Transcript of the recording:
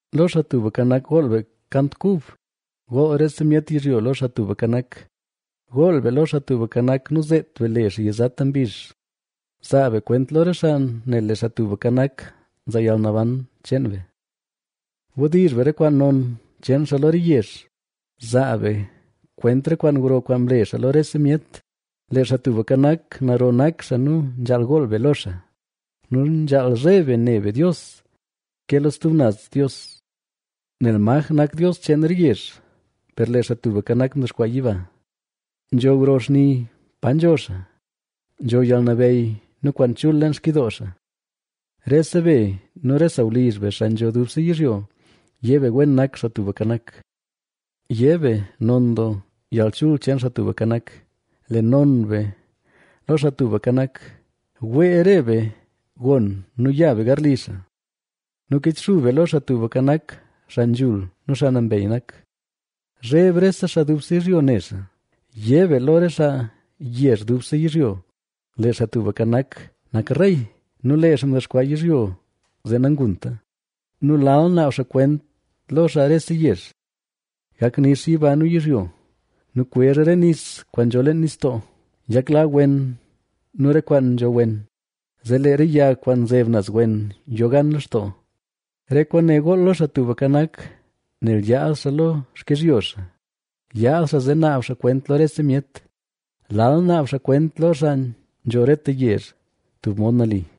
Lo Xaa Tubka Nak, gool be kant kub. Gool rese myet yizhyo lo Xaa Tubka Nak. Gool be lo Xaa Tubka Nak, nu zeet be le xaa yizata mbizh. Zaa be kwent lo re xaa nel lee Xaa Tubka Nak, nzaa yalnaban cheen be. Wdizh be re kwaan non cheen xaa lo re yezh, zaa be kwent re kwaan gro kwaan mle xaa lo rese myet. Lee Xaa Tubka Nak, naro nak xaa nu nzhaal gool be lo xaa nu nzhaal zheb be ne be Dios ke lo stub naz dios. Nel maj nak dios cheen re yezh; per lee Xaa Tubka Nak mdexkwaa yiba. Nzho gro xni pa nzho xaa; nzho yalnabeyy nu kwaan chul leen xkyidoo xaa. Rese be nu re sawlizh be, xaa nzho dubse yizhyo, yé be wen nak Xaa Tubka Nak yé be non doo yalchul cheen Xaa Tubka Nak. Le non be lo Xaa Tubka Nak; wee re be gon nu ya be garli xaa. Nu kichxub be lo Xaa Tubka Nak xaa nzhul nu xaa nambey nak. ¡Zheb rese xaa dubse yizhyo ne xaa! Yé be lo re xaa yezh dubse yizhyo: “¡Lee Xaa Tubka Nak nak rey!” Nu lee xaa mdexkwaa yizhyo zee nangunta; nu lal naab xaa kwent lo xaa rese yezh. ¡Gak nix yiba nu yizhyo nu kwezh re nis kwaan nzho leen nistoo! ¡Yakla wen nu re kwaan nzho wen; zee lee re yag kwaan nzeb naz wen yo gan lextoo! Re kwaane gool lo Xaa Tubka Nak nel yaad xaa lo xkizhyo xaa; yaad xaa zee naab xaa kwent lo rese myet. Lal naab xaa kwent lo xaa nzho reta yezh tub mod nali.